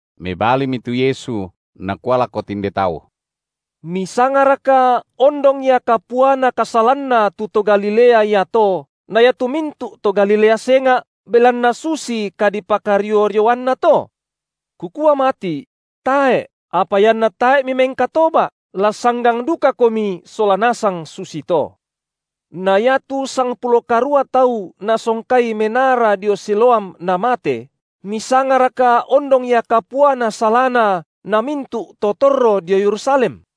Mebalimi tu Yesu, Nakua lako tinde tau: Misangaraka ondong ia kapuana kasalanna tu to Galilea iato na iatu mintu’ to Galilea senga’, belanna susi kadipakario-rioanna to? Kukua mati’: tae’, apa ianna tae’ mimengkatoba’, la sanggang dukakomi sola nasang susito. Na iatu sangpulo karua tau nasongkai menara dio Siloam namate, misangaraka ondong ia kapuana salana na mintu’ to torro dio Yerusalem?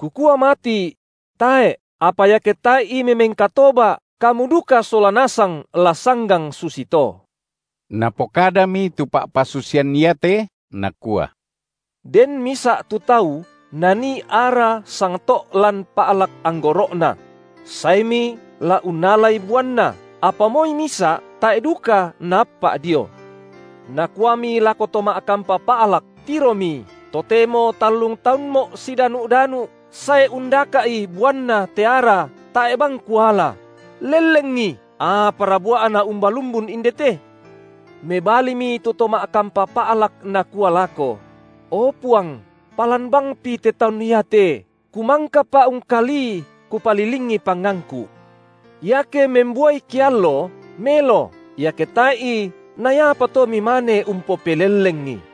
Kukua mati’: tae’, apa iake tae’i mimengkatoba’ kamu duka sola nasang la sanggang susito. Napokadami tu pa’pasusian iate, Nakua: Den misa’ tu tau nanii ara sangto’ lan pa’lak anggoro’na; saemi la unnalai buanna, apa moi misa’ tae’ duka naappa’ dio. Nakuami lako to ma’kampa pa’lak: Tiromi, totemo tallung taunmo’ sidanu’-danu’, sae undaka’i buanna te ara, tae’ bang kuala; lellengi, apara bua’na umbalumbun indete? Mebalimi tu to ma’kampa pa’lak, nakua lako: O Puang, palan bangpi te taun iate, kumangkapa ungkalii, kupalilingi pangangku’. Iake membuai keallo, melo, iake tae’i, na iapa to mimane umpopelellengi.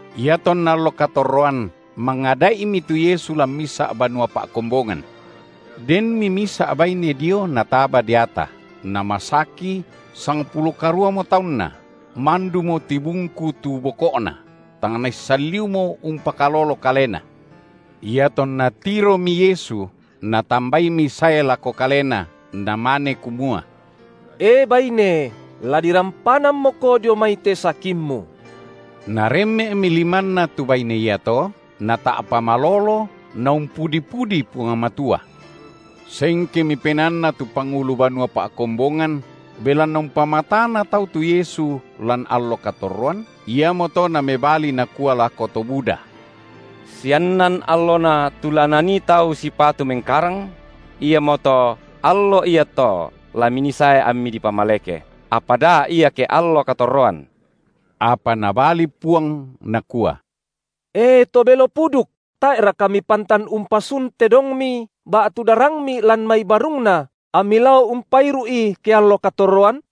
Iatonna allo katorroan, mangada’imi tu Yesu lan misa’ banua pa’kombongan. Denmi misa’ baine dio nataba deata, namasaki sangpulo karuamo taunna, mandumo tibungku tu boko’na, tang naissan liumo umpakalolo kalena. Iatonna tiromi Yesu, Natambaimi sae lako Kalena, Namane kumua: E, baine, la dirampanammoko dio mai te sakimmu. Naremme’mi limanNa tu baine iato, nata’pa malolo, naumpudi-pudi Puang Matua. Sengkemi penaanna tu pangulu banua pa’kombongan, belanna umpamatana tau tu Yesu lan allo katorroan, iamoto namebali nakua lako to buda: Siannan allona tu la nanii tau sipatu mengkarang: iamoto allo iato la minii sae ammi dipamaleke, apa da ia ke allo katorroan. Apa Nabali Puang, Nakua: E to belo puduk, tae’raka mipantan umpasun tedongmi ba’tu darangmi lan mai barungna, ammi lao umpairu’i ke allo katorroan?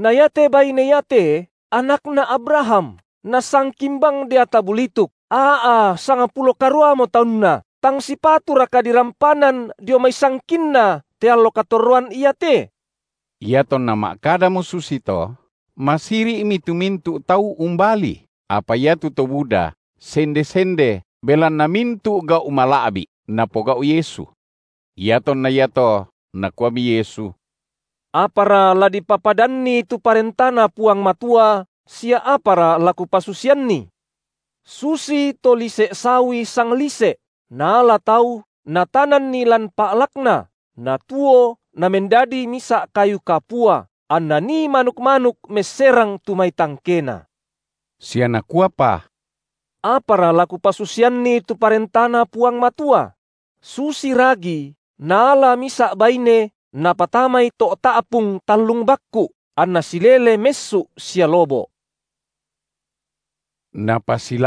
Na iate baine iate anakna Abraham, nasangkin bang deata bulituk, aa sangpulo karuamo taunna, tang sipaturaka dirampanan dio mai sangkinna te allo katorroan iate? Iatonna ma’kadamo susito, masiri’mi tu mintu’ tau umbalii, apa iatu to buda sende-sende belanna mintu’ gau’ mala’bi’, Napogau’ Yesu. Iatonna iato Nakuami Yesu: Apara la dipapadanni tu ParentaNa Puang Matua sia apara la Kupasusianni? Susito lise’ sawi sanglise’, naala tau, natananni lan pa’lakna, natuo namendadi misa’ kayu kapua, anna nii manuk-manuk messerang tu mai tangkena. Sia Nakuapa: Apara la Kupasusianni tu ParentaNa Puang Matua? Susi ragi naala misa’ baine napatamai to’ ta’pung tallung bakku’, anna silele messu’ sia lobo’. Diona ba’ba sukku’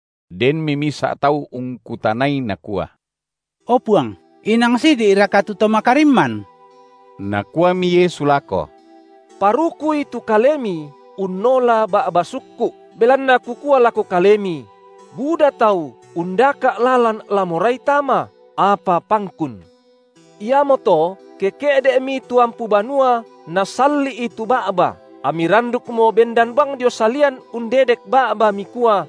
Denmi misa’ tau ungkutanai, nakua: O Puang, inang sidi’raka tu to makarimman? Nakuami Yesu lako: Parukui tu kalemi unnola ba’ba sukku’, belanna Kukua lako kalemi: Buda tau undaka’ lalan la morai tama, apa pangkun. Iamoto ke ke’de’mi tu ampu banua nasalli’i tu ba’ba, ammi randukmo bendan bang dio salian undedek ba’ba, mikua: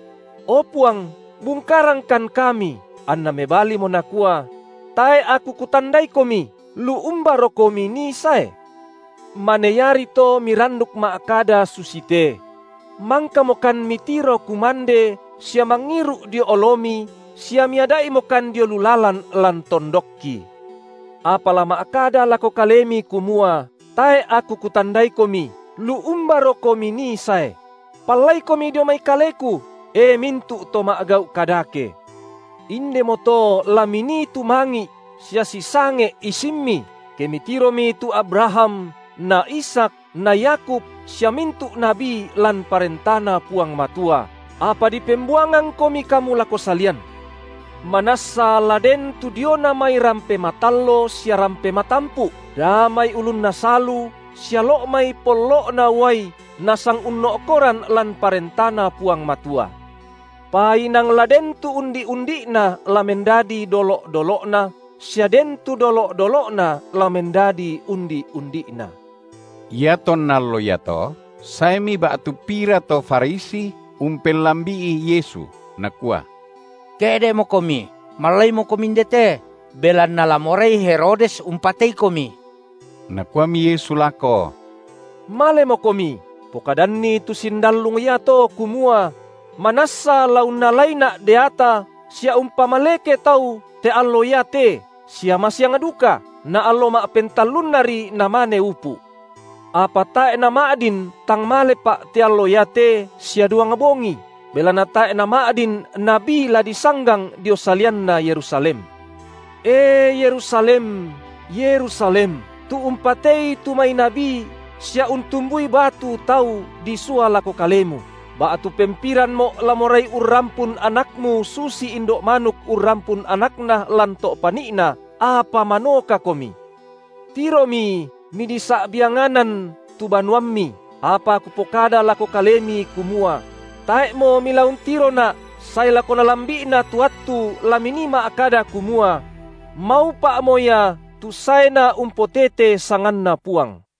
O Puang, bungkarangkan kami, anNa mebalimo Nakua: Tae’ Aku kutandaikomi, lu umbarokomi nii sae? Mane iari to miranduk ma’kada susite: Mangkamokan Mitiro kumande sia mangiru’ dio oloMi sia Miada’imokan dio lu lalan lan tondokki. Apa la ma’kada lako kalemi kumua: Tae’ Aku kutandaikomi, lu umbarokomi nii sae? Pallaikomi dio mai Kaleku, e mintu’ to ma’gau’ kadake. Indemoto la minii tumangi’ sia sisange’ isimmi, ke mitiromi tu Abraham na Ishak na Yakub sia mintu’ nabi lan ParentaNa Puang Matua, apa dipembuangangkomi kamu lako salian. Manassa la den tu diona mai rampe matallo sia rampe matampu’, daa mai ulunna salu sia lo’ mai pollo’na uai nasangunno’koran lan ParentaNa Puang Matua. Pa inang la den tu undi’-undi’na la mendadi dolo’-dolo’na, sia den tu dolo’-dolo’na la mendadi undi’-undi’na. Iatonna allo iato saemi ba’tu pira to Farisi umpellambi’i Yesu, nakua: Ke’de’moKomi, mallaimoKomi indete, belanna la morai Herodes umpateiKomi. Nakuami Yesu lako: Malemokomi, pokadanni tu sindallung iato, kumua: Manassa la unnalaiNa’ deata sia umpamaleke tau te allo iate sia masiang duka, na allo ma’pentullannari namane upu’. Apa tae’ nama’din tang malePa’ te allo iate sia duang bongi, belanna tae’ nama’din nabi la disanggang dio salianna Yerusalem. E Yerusalem, Yerusalem, tu umpatei tu mai nabi sia untumbui batu tau disua lako kalemu, ba’tu pempiranMo’ la morai urrampun anakmu susi indo’ manuk urrampun anakna lan to’ pani’na, apa manokakomi. Tiromi midisa’bianganan tu banuammi, apa Kupokada lako kalemi, kumua: Tae’mo mila untiroNa’ sae lako nalambi’na tu attu la minii ma’kada kumua: Maupa’mo Ia tu saena umpotete sanganNa Puang.